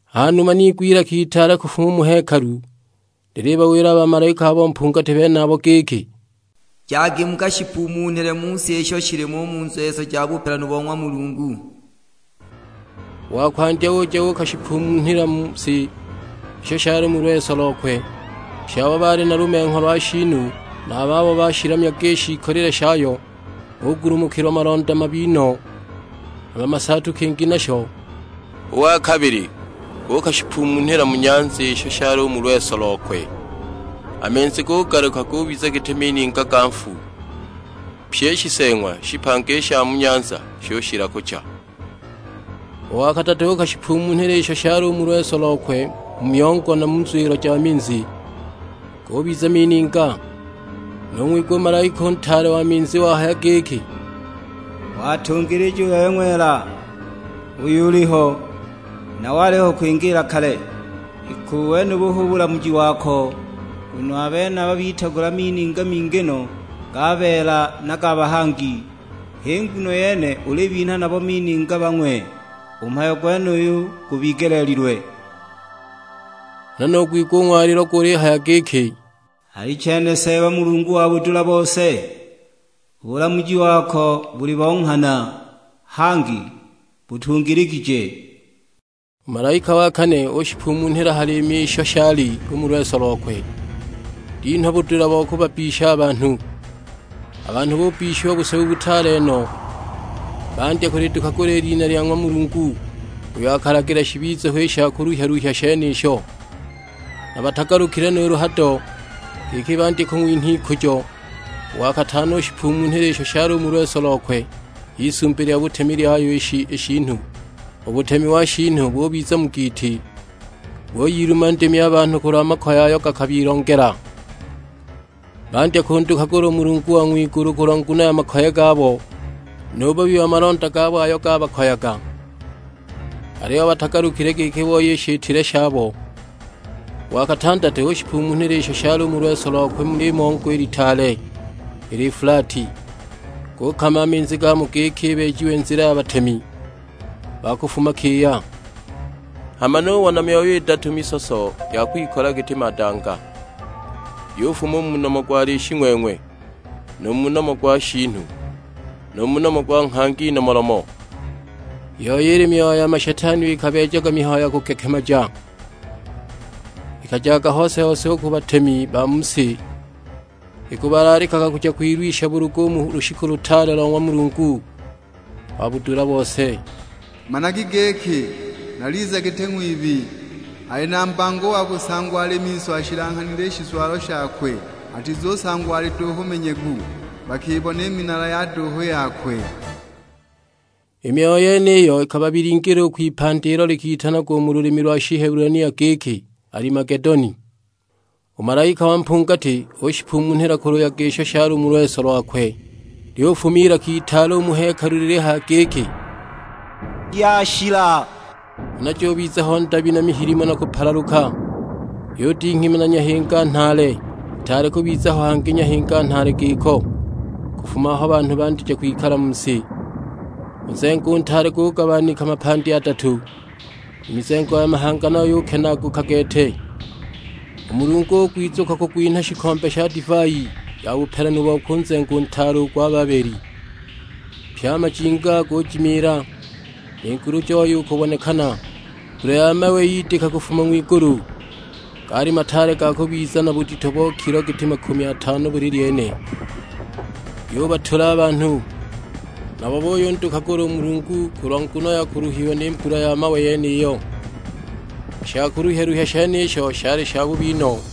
Hanuma niigwa ilaka itaale kufuma u mu hekalu lilibawila a bamalaika abo mpungati benabo giki, "Jagi mukashipumunhile mu si isho shilimo u mu nzweso ja bupelanu bo ng'wa Mulungu!" U wa kwandya uja uukashipumunhila mu si isho shali u mu lweso lokwe; pye abo baali na lumengho lwa shiinu na a babo bashilamyaga i shiikolile shayo bugulumukilwa malonda mabi no, hama masaatu kingi nasho! U wa kabili uukashipumunhila mu nyanza isho shali u mu lweso lokwe; a minzi gugaluka gubiza giti mininga ga nfu! Pye i shiseeng'wa shipanga i sha mu nyanza shushila kucha. U wa kadatu uukashipumunhila isho shali u mu lweso lokwe mu myongo na mu nzwilo ja minzi; gubiza mininga! Nung'wigwa u malaika u ntaale wa minzi wahaya giki, "Watungilija u bebe ng'wela, uyo uliho, na waliho kwingiila kale; iki u wenubu hu bulamuji wako! Nguno a benaba bitagula mininga mingi no ga beela na ga bahangi, h'i nguno yene ulibinha nabo mininga bang'we; u mhayo gwenuyu gubigeleelilwe!" Huna nugwigwa u ng'walilo gulihaya giki, "Alichene Seeba Mulungu wa budula bose, u bulamuji wako buli bo nghana, hangi butungiligije!" U malaika wa kane ushipumunhila ha liimi isho shali u mu lweso lokwe, linhwa budula bo kubabbisha a banhu. A banhu bubbishiwa busebu butaale no, bandya kulidukagula i lina lya ng'wa Mulungu uyo akalagila shibize ho i sha kuluhya-luhya shenisho; na batagalukile nuulu hado, giki bandye kung'winha ikujo! U wa katano ushipumunhila isho shali u mu lweso lokwe h'isumbi lya butemi lyayo i shiinu; u butemi wa shiinu bubiza mu giiti; buyiluma ndimi a banhu kulwa makoye ayo gakabilongela. Bandya kundukagula u Mulungu wa ng'wigulu kulwa nguno ya makoye gabo, nu bubi wa malonda gabo ayo gabakoyaga. Aliyo batagalukile giki booye i shitile shabo! U wa katandatu ushipumunhila isho shali u mu lweso lokwe mu limongo i litaale, i Lifulati; gukama a minzi gamo giki ibeejiwe nzila ya batemi ba kufuma kiya. Hama nubona myoyo idatu misoso ya kwikola giti madanga; yufuma u mu nomo gwa Lishing'weng'we, nu mu nomo gwa shiinu, na mu nomo gwa nghangi nomolomo. I yoi ili myoyo ya mashetani iyo ikabeejaga mihayo ya kugekemaja; ikajaga hose-hose u ku batemi ba mu si, ikubalaalikaga kuja kwilwisha bulugu u mu lushiku lutaale lo ng'wa Mulungu wa budula bose. "Managa giki, naliza giti ng'wibi, ali na mbango u wa kusangwa ali miso ashilanghanile i shizwalo shakwe, atizusangwa ali duuhu manyegu, bakibona i minala ya duuhu yakwe!" I myoyo yeniyo ikababilingila kwipandi ilo likitanagwa u mu lulimi lwa Shihebulania giki Alimagedoni. U malaika wa mpungati ushipumunhila ku luyaga isho shali u mu lweso lwakwe; lyufuma ilaka itaale u mu hekalu lilihaya giki, "Yashila!" Huna jubiza ho ndabi na mihilimo na kupalaluka, yudinghima na nyahinga nhaale: itaali kubiza ho hangi nyahinga nhaale giko kufuma aho banhu bandija kwikala mu si. U nzengo u ntaale gugabanika mapandi adatu, i mizengo ya mahanga nayo yukenaaguka gete; u Mulungu ugwizukwa kugwinha shikombe sha divai ya bupelanu bokwe u nzengo u ntaale u gwa Babeli. Pye a majinga gujimiila, ni ngulu joya u kubonekana. Mbula ya mawe yidika kufuma ng'wigulu; gaali mataale ga kubiza na budito bo kilo giti makumi atano buli lyene. Yubatula a banhu, nabo buyundukagula u Mulungu kulwa nguno ya kuluhiwa ni mbula ya mawe yeniyo. I sha kuluhya-luhya shenisho shali shabubi no!